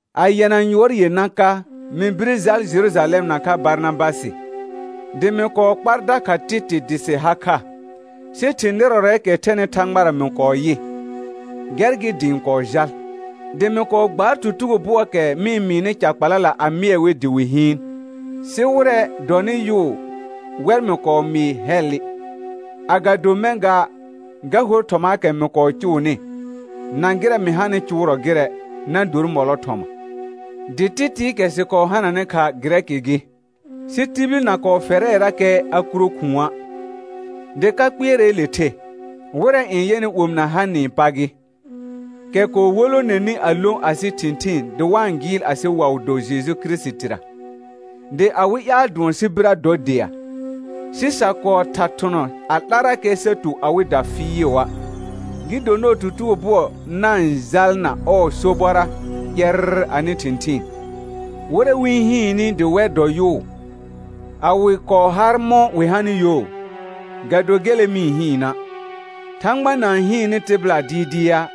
A yɛna yʋɔr yenã ka, mɩ bire jal Jerujalɛm nakha Barnabasɩ, dɩ mɩ kɔɔ kpar dakha Tɩtɩ dɩ sɩ ha kha. Sɩ thɩ̃ nɩrɔrɛɛkɛ thɛnɩ Thãgbara mɩ kɔɔ yɩ, gɛr gɩ dɩ ɩ̃ kɔɔ jal. Dɩ mɩ kɔɔ gbaar tutugo bʋɔɔkɛ mɩ-n mɩɩnɩ ca kpala a mɩɛ wɩ dɩ wɩ hɩɩn; sɩ wɩrɛ dɔnɩ yʋʋ wɛr mɩ kɔɔ mɩɩ hɛllɩ, agado mɛ̃ gaa, ga hor thɔmaakɛ mɩ kɔɔ cʋʋnɩ, na gɩrɛ mɩ hanɩ cʋʋrɔ gɩrɛ, na dor mɔlɔ thɔma. Dɩ Tɩtɩɩkɛ sɩ kɔɔ hananɩ kha Gɩrɛkɩ gɩ, sɩ tibil na kɔɔ fɛrɛɛrakɛ a kuro khʋ̃a'. Dɩ ka kpɩɛrɛɛle the, wɩrɛ n yɛnɩ omɩna hanɩɩ pa gɩ, kɛ kɔɔ wolonenɩ a lõ asɩ thɩ̃thɩɩn dɩ wa-n gɩɩl asɩ waʋ do Jeju Kirisitira, dɩ awɩ ƴaal dʋɔn sɩ birə dɔ dea. Sɩ sa kɔɔ tha thʋnɔ a 'larrakɛ sa tu awɩda fɩɩʋa', gɩ do nɔɔ tutugo bʋɔ na-n jalna ɔɔ sobɔra ƴɛrr anɩ thɩ̃thɩɩn. Wɩrɛ wɩ-n hɩɩnnɩ dɩ wɛr dɔ yʋʋ, a wɩ kɔɔ har mɔ̃ wɩ hanɩ yo, ga do gele mɩ-n hɩɩna', Thãgba na-n hɩɩnnɩ tɩbɩla dɩɩdɩa',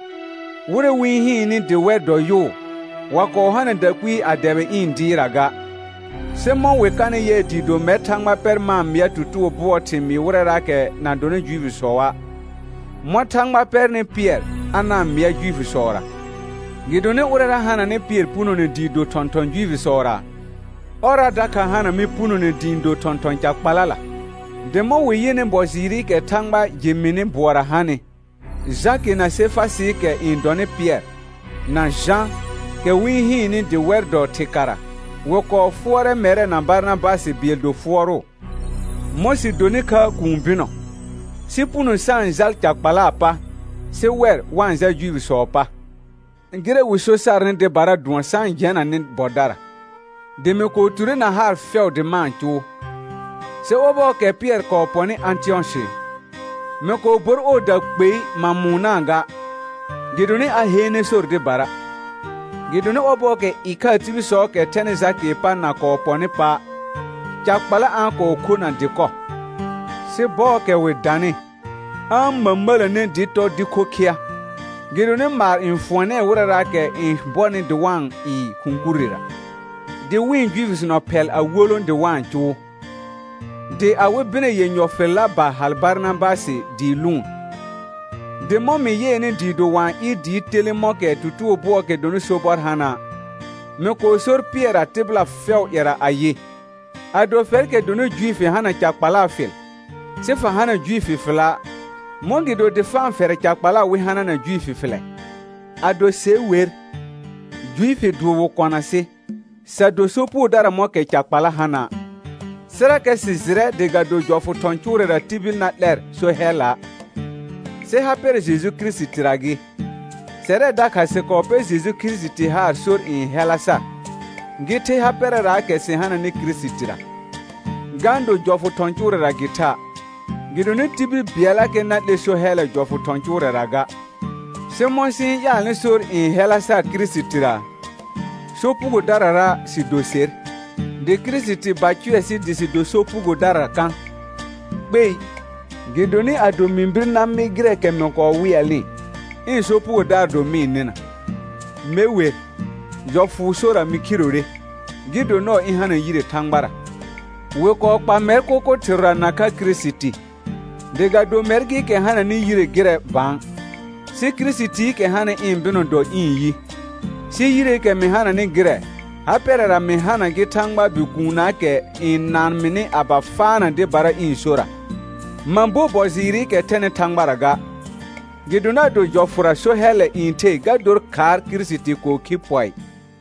wɩrɛ wɩ-n hɩɩnnɩ dɩ wɛr dɔ yʋʋ, wa kɔɔ hana dakpɩɩ na dɛbɩ ɩ̃ dɩɩrra ga. Sɩ mɔ̃ wɩ kanɩ yɩɛ dɩɩ do mɛr Thãgba pɛr ma-n mɩa tutugo bʋɔɔ thɩmɩɩ wɩrɛraakɛ na dɔnɩ Juifisɔa', mɔ̃ Thãgba pɛrnɩ Pɩɛr a na-n mɩa Juifisɔra, gɩdonɩ ʋrɛra hananɩ Pɩɛr punone dɩ do thɔ̃thɔn Juifisɔra, ɔrra dakha hana mɩ punone dɩ ɩ̃ do thɔ̃thɔn ca kpalala, dɩ mɔ̃ wɩ yɩnɩ bɔ jɩɩrɩkɛ Thãgba jɩ mɩnɩ bʋɔra hanɩ, Jakɩ na Sefasɩɩkɛ n dɔnɩ Pɩɛr, na Jã, kɛ wɩ-n hɩɩnnɩ dɩ wɛr dɔ thɩkara, wɩ kɔɔ fʋɔrɛ mɛrɛ na Barnabasɩ bɩɛl do fʋɔrʋʋ, mɔ̃ sɩ donɩ kha kũu bɩnɔ, sɩ puno sa-n jal ca kpalaa pa, sɩ wɛr wa-n jal Juifisɔɔ pa. Gɩrɛ wɩ so sarnɩ dɩbara dʋɔn sa-n jɛna nɩ bɔdara, dɩ mɩ kɔɔ ture na haar fɛʋ dɩ ma-n cʋʋ. Sɩ ɔbɔɔkɛ Pɩɛr kɔɔ pɔnɩ Ãtɩyɔsɩ, mɩ kɔɔ bor ɔɔda kpei ma mʋʋnaa ga, gɩdonɩ a heene sor dɩbara. Gɩdonɩ ɔbɔɔkɛ ɩkhaa tibilsɔɔkɛ thɛnɩ Jakɩɩ pa na kɔɔ pɔnɩ pa', ca kpala a-n kɔɔ khona dɩkɔ, sɩ bɔɔkɛ wɩ danɩ, a-n mə̃mə̃ləne dɩ tɔ dɩ khokhɩa, gɩdonɩ maar n fʋɔnɛɛ wɩrɛraakɛ n bɔnɩ dɩ wa-n ɩɩ khʋ̃ kurrera. Dɩ wɩ̃ Juifisnɔ phɛl a wolõ dɩ wa-n cʋʋ, dɩ awɩ bɩnɛ yenyɔ fɩlla ba hal Barnabasɩ dɩ lʋʋn. Dɩ mɔ̃ mɩ yɩɛnɩ dɩɩ do wa-n ɩɩr dɩɩ telẽ mɔ̃kɛ tutugo bʋɔɔkɛ dɔnɩ sobɔr hana', mɩ kɔɔ sor Pɩɛrra tɩbɩla fɛʋʋ ƴɛra ayɩ: Ado fɛrkɛ dɔnɩ Juifi hana ca kpalaa fɩl, sɩ fa hana Juifi fɩla', mɔ̃gɩdo dɩ fa-n fɛrɛ ca kpala wɩ hanana Juifi fɩlɛ? Ado se wer, Juifi dʋʋr wɩ kɔna sɩ, sa do sopugodara mɔ̃kɛ ca kpala hana'. Sɩrakɛ sɩ jɩrɛ dɩ ga do jɔfʋ thɔ̃ cʋʋrɛra tibil na 'lɛr so hɛlla', sɩ ha pɛrɛ Jeju Kirisitira gɩ; sɛrɛ dakha sɩ kɔɔ pɛr Jeju Kirisiti haar sor n hɛla sar, gɩ the ha pɛrɛraakɛ sɩ hananɩ Kirisitira, ga-n do jɔfʋ thɔ̃ cʋʋrɛra gɩ tha', gɩdonɩ tibil bɩɛllakɛ na 'lɛ so hɛllɛ jɔfʋ thɔ̃ cʋʋrɛra ga. Sɩ mɔ̃ sɩ-n ƴaalnɩ sor n hɛla sar Kirisitira, sopugodarara sɩ do ser, dɩ Kirisiti ba cʋɛ sɩ dɩ sɩ do sopugodara kã? Kpei. Gɩdonɩ ado mɩ bir na mɩ gɩrɛɛkɛ mɩ kɔɔ wɩɛlnɩ, ɩ̃ sopugodaar do mɩ-n nɩna. Me wer, jɔfʋʋ sora mɩ khirore, gɩ do nɔɔ ɩ̃ hana yire Thãgbara. Wɩ kɔɔ kpa mɛr kʋkʋ thɩrʋra nakha Kirisiti, dɩ ga do mɛr gɩɩkɛ hananɩ yire gɩrɛ bã, sɩ Kirisitiikɛ hanɩ ɩ̃ bɩnɔ dɔ ɩ̃ yi; sɩ yireekɛ mɩ hananɩ gɩrɛ, ha pɛrɛra mɩ hana gɩ Thãgbaa Bikuunnaakɛ n naan mɩnɩ a ba faana dɩbara ɩ̃ sora. Ma bo bɔ jɩɩrɩkɛ thɛnɩ Thãgbara ga, gɩdonɩ ado jɔfʋra so hɛllɛ n the ga dor khaar Kirisiti kɔɔ khi pɔɩ.